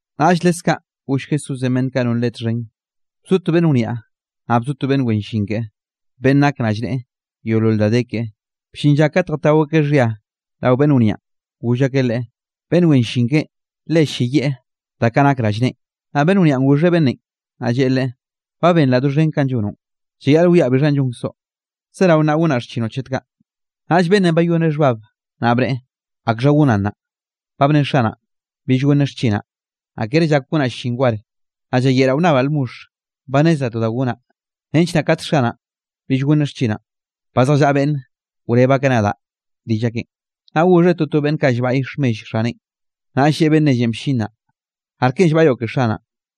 Naꞌll leskaꞌ goll Jesúsenꞌ beꞌnn kaꞌ non Leꞌe txhen: —Bzo to beꞌnn wniaꞌ, naꞌ bzo to beꞌnn wen llin keꞌe, beꞌnn nak rallneꞌe yeolol da de keꞌe; bllin lla kate jatao akeꞌ xhia rao beꞌnn wniaꞌn, goll akeꞌ leꞌe, beꞌnn wen llin keꞌen le ll-lleyieꞌ da kaꞌ nak rallneꞌen. Naꞌ beꞌnn wniaꞌn goxheꞌ beꞌnnenꞌ, naꞌ lleꞌe leꞌe: “Ba benraꞌ doxhen kanꞌ llonoꞌn. Llayaꞌl wiaꞌ bixhanꞌ llonkzoꞌ, zerao nnaꞌ gonnaꞌ xchinoꞌ chet kaꞌ.” Naꞌll beꞌnnenꞌ bayoneꞌ xhbab, naꞌ bneꞌe: “¿Akxha gonaꞌ nnaꞌ, ba bne xanaꞌn bill gonneꞌ xchinaꞌ? Naꞌ kere llak gonaꞌ llin war, naꞌ llayeꞌraꞌ wnnabaꞌ lmoxh. Ba nnezraꞌ to da gonaꞌ nench kate xanaꞌn bill gonneꞌ xchinaꞌn, ba zjallaꞌa beꞌnn wreb akeꞌ nadaꞌ rill akeꞌn.” Naꞌ goxheꞌ toto beꞌnn kaꞌ llbaꞌy xhmell xaneꞌn, naꞌll lleꞌe beꞌnn nellenꞌ bllin naꞌ: “¿Arke llbaꞌyoꞌ ke xanaꞌn?”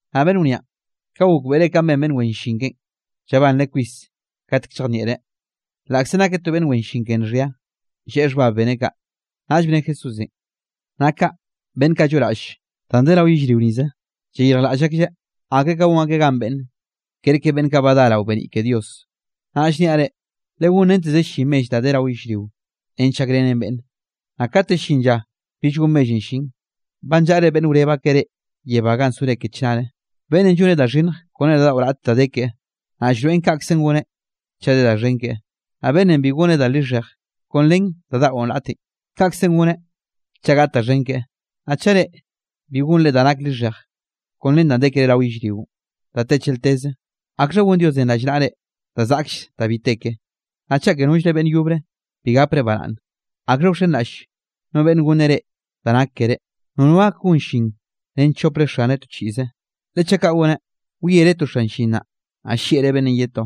Naꞌ beꞌnn wniaꞌn, ka gokbeꞌreꞌ kanꞌ ben beꞌnn wen llin keꞌen, llabanreꞌ kwis katek llejnieꞌreꞌ, laꞌkze nake to beꞌnn wen llin ke nxhia, lleꞌe xhbab beneꞌ kaꞌ. Naꞌll bne Jesúsenꞌ: —Naꞌ kaꞌ, beꞌnn kaꞌ lloꞌraꞌll danꞌ de rao yellrio nize, llayirjlaꞌll aklleꞌ, akre ka gon akeꞌ gan beꞌnne, kerke beꞌnn kaꞌ ba dá rao beniꞌ ke Dios. ’Naꞌ llniaꞌ reꞌ, legonrenteze llin mell danꞌ de rao yellrionꞌ, nench gakrenre beꞌnne, naꞌ kate llin lla bill gon mellenꞌ llin, ba nllaꞌre beꞌnn wreb akeꞌ reꞌ yebá ga sore ke chnare. ’Beꞌnnenꞌ lloneꞌ da lixhej kone da daꞌo raꞌt da de keꞌe, naꞌ llroeꞌn kaꞌkze goneꞌ chaꞌ de da xhen keꞌe. Naꞌ beꞌnnenꞌ bi goneꞌ da lixhej kon ren da daꞌo raꞌten, kaꞌkze goneꞌ chaꞌ gaꞌt da xhen keꞌe. Naꞌ chaꞌ reꞌ, bi gonre da nak lixhej kon ren da de kere rao yellrionꞌ da te chelteze, ¿akxha gon Diosenꞌ rallnaꞌre da zaꞌkll da bi te ke? Naꞌ chaꞌ ke nollre beꞌnn yobre, bi gaprenꞌ baraꞌnn, ¿akxha wxenraꞌll no beꞌnne gonneꞌ reꞌ da nak keré? ’Nono gak gon llin ren chopre xaneꞌ to chiꞌze, le chaꞌ kaꞌ goneꞌ, wiereꞌ to xan llin naꞌ, naꞌ llieꞌreꞌ beꞌnnenꞌ ye to;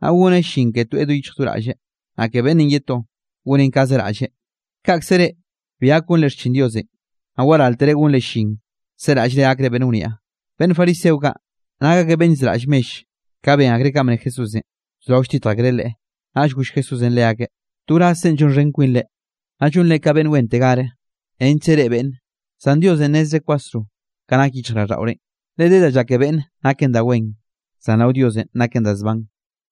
naꞌ goneꞌ llin ke toeꞌ do yichj do raꞌlleꞌ, naꞌ ke beꞌnnenꞌ ye to, goneꞌn kaꞌze raꞌlleꞌ. Kaꞌkze ke reꞌ bi gak gonre xchin Diosenꞌ, naꞌ waráltere gonre llin seraꞌllre gakre beꞌnn wniaꞌ. Beꞌnn fariseo kaꞌ, nak akeꞌ beꞌnn llzeraꞌll mell, ka ben akreꞌ kanꞌ bne Jesúsenꞌ, bzorao lltitj akreꞌ Leꞌe. Naꞌll goll Jesúsenꞌ leakeꞌ: —To wrazrenꞌ llonxhen kwinre, naꞌ llonre ka beꞌnn wen tegar nechkze reꞌe beꞌnne, zan Dios nnezreꞌ kwasro ka nak yichjraꞌlldaꞌorenꞌ. Le de da llake beꞌnne, naken da wen, zan rao Diosenꞌ naken da zban.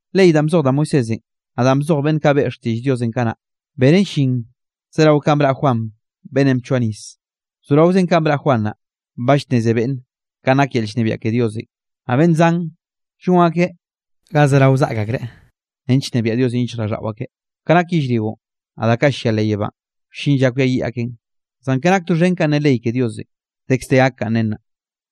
’Ley danꞌ bzoj da Moisésenꞌ, naꞌ danꞌ bzoj beꞌnn kaꞌ beꞌe xtiꞌll Diosenꞌ kanaꞌ, benen llin zerao ka braꞌ Juan beꞌnnenꞌ bchoa nis. Bzoraozen kanꞌ braꞌ Juan naꞌ, ba llnneze beꞌnne kanꞌ nak yel llnebiaꞌ ke Diosenꞌ, naꞌ beꞌnn zan llon akeꞌn ga zerao zaꞌk akreꞌ, nench nnebiaꞌ Diosenꞌ yichjraꞌlldaꞌo akeꞌ. ’Ka nak yellrionꞌ, naꞌ da kaꞌ llia leꞌ yebánꞌ, wllin lla kwiayiꞌ aken, zan ke nak doxhen kanꞌ ne ley ke Diosenꞌ, dekz de gak kanꞌ nen naꞌ.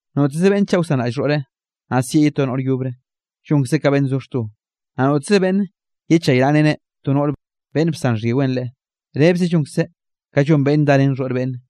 ’Noteze beꞌnn chaꞌ wsanraꞌll xhoꞌreꞌ, naꞌ sieꞌ ye to noꞌr yobre, llonkzeꞌ ka beꞌnn zo xto. Naꞌ noteze beꞌnn yechaynaꞌreneꞌ to noꞌre beꞌnn bsan xhyiweꞌn leꞌe, rebze llonkzeꞌ ka llon beꞌnnenꞌ darén xhoꞌr beꞌnne.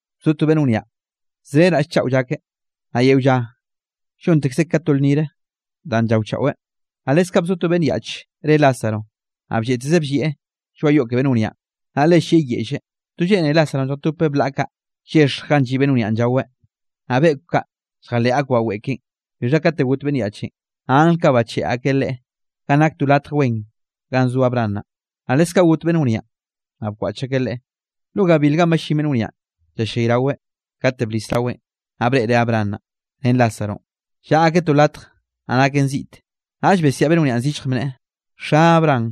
’Bzo to beꞌnn wniaꞌ zre raꞌll chaꞌo llakeꞌ, naꞌ yeo lla llontekzeꞌ ka to lnnire danꞌ llaochaꞌweꞌ. Naꞌ leskaꞌ bzo to beꞌnn yaꞌch re Lázaro, naꞌ blleꞌtezeꞌ bllieꞌ lloaꞌ yoꞌ ke beꞌnn wniaꞌn, naꞌ le llieꞌ yeꞌlle. To lleꞌne Lázaronꞌ lljatopeꞌ blaꞌa kaꞌ, llexj ganꞌ lliꞌ beꞌnn wniaꞌn llaweꞌ, naꞌ beꞌkw ake lljaleꞌ akbaꞌ weꞌe keꞌen. Bixha kate got beꞌnn yaꞌchenꞌ, naꞌ angl kaꞌ bacheꞌe akeꞌ leꞌe ganꞌ nak to latj wen ganꞌ zo Abraham naꞌ. Naꞌ leskaꞌ got beꞌnn wniaꞌn, naꞌ bkwaꞌch akeꞌ leꞌe. Lo gabil ganꞌ ballín beꞌnn wniaꞌn llallayraweꞌ, kate blis raweꞌn, naꞌ breꞌreꞌ Abraham naꞌ, ren Lázaronꞌ, llaꞌa akeꞌ to latj naꞌ naken ziꞌte. Naꞌll besiaꞌ beꞌnn wniaꞌn zillj bneꞌe: “Xa Abraham,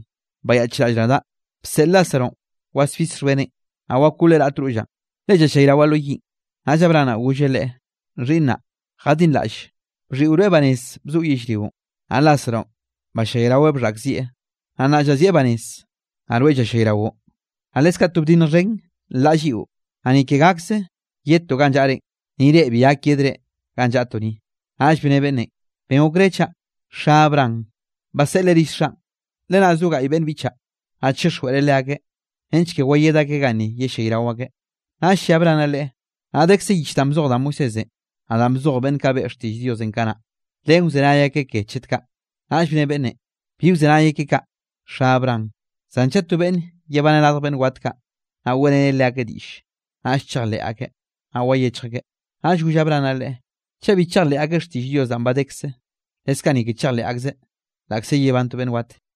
bayaꞌchraꞌll nadaꞌ, bseꞌl Lázaronꞌ wasbis xhbeneꞌn, naꞌ wakoleꞌ raꞌt rollaꞌn, le llallayrawaꞌ lo yiꞌn.” Naꞌll Abraham naꞌ, golleꞌ leꞌe: “Xhiꞌnnaꞌ, jadinraꞌlle, bxhiꞌo rweꞌ banez bzoꞌo yellrionꞌ, naꞌ Lázaronꞌ ballayraweꞌ bxhaꞌkzieꞌ, naꞌ nnaꞌ llazieꞌ banez, naꞌ rweꞌ llallayraoꞌ. Naꞌ leskaꞌ to bdinnj xhen, nlaꞌn lliꞌo, naꞌ ni ke gakze yedtoꞌ ganꞌ llaꞌrenꞌ, ni reꞌ bi gak yedre ganꞌ llaꞌtoꞌ ni.” Naꞌll bne beꞌnnenꞌ: “Ben gokre chaꞌ, xa Abraham, baseꞌleꞌ rill xaꞌn, Le nna zo gaꞌy beꞌnn biꞌchaꞌ, naꞌ chixjweꞌreꞌ leakeꞌ nench ke wayed akeꞌ ganni yellayrao akeꞌ.” Naꞌll lle Abraham naꞌ leꞌe: “Naꞌ dekze yich danꞌ bzoj da Moisésenꞌ, naꞌ danꞌ bzoj beꞌnn kaꞌ beꞌe xtiꞌll Diosenꞌ kanaꞌ, len wzenay akeꞌ ke chet kaꞌ.” Naꞌll bne beꞌnnenꞌ: “Bi wzenay akeꞌ kaꞌ, xa Abraham, zan chaꞌ to beꞌnn yebaneꞌ radj beꞌnn wat kaꞌ, naꞌ weꞌreneꞌ leakeꞌ diꞌlle, naꞌll chejleꞌ akeꞌ, naꞌ wayechj akeꞌ.” Naꞌll goll Abraham naꞌ leꞌe: “Chaꞌ bi chejleꞌ akeꞌ xtiꞌll Dios danꞌ ba dekze, leskaꞌ ni ke chejleꞌ akzeꞌ, laꞌkze yebán to beꞌnn wat.”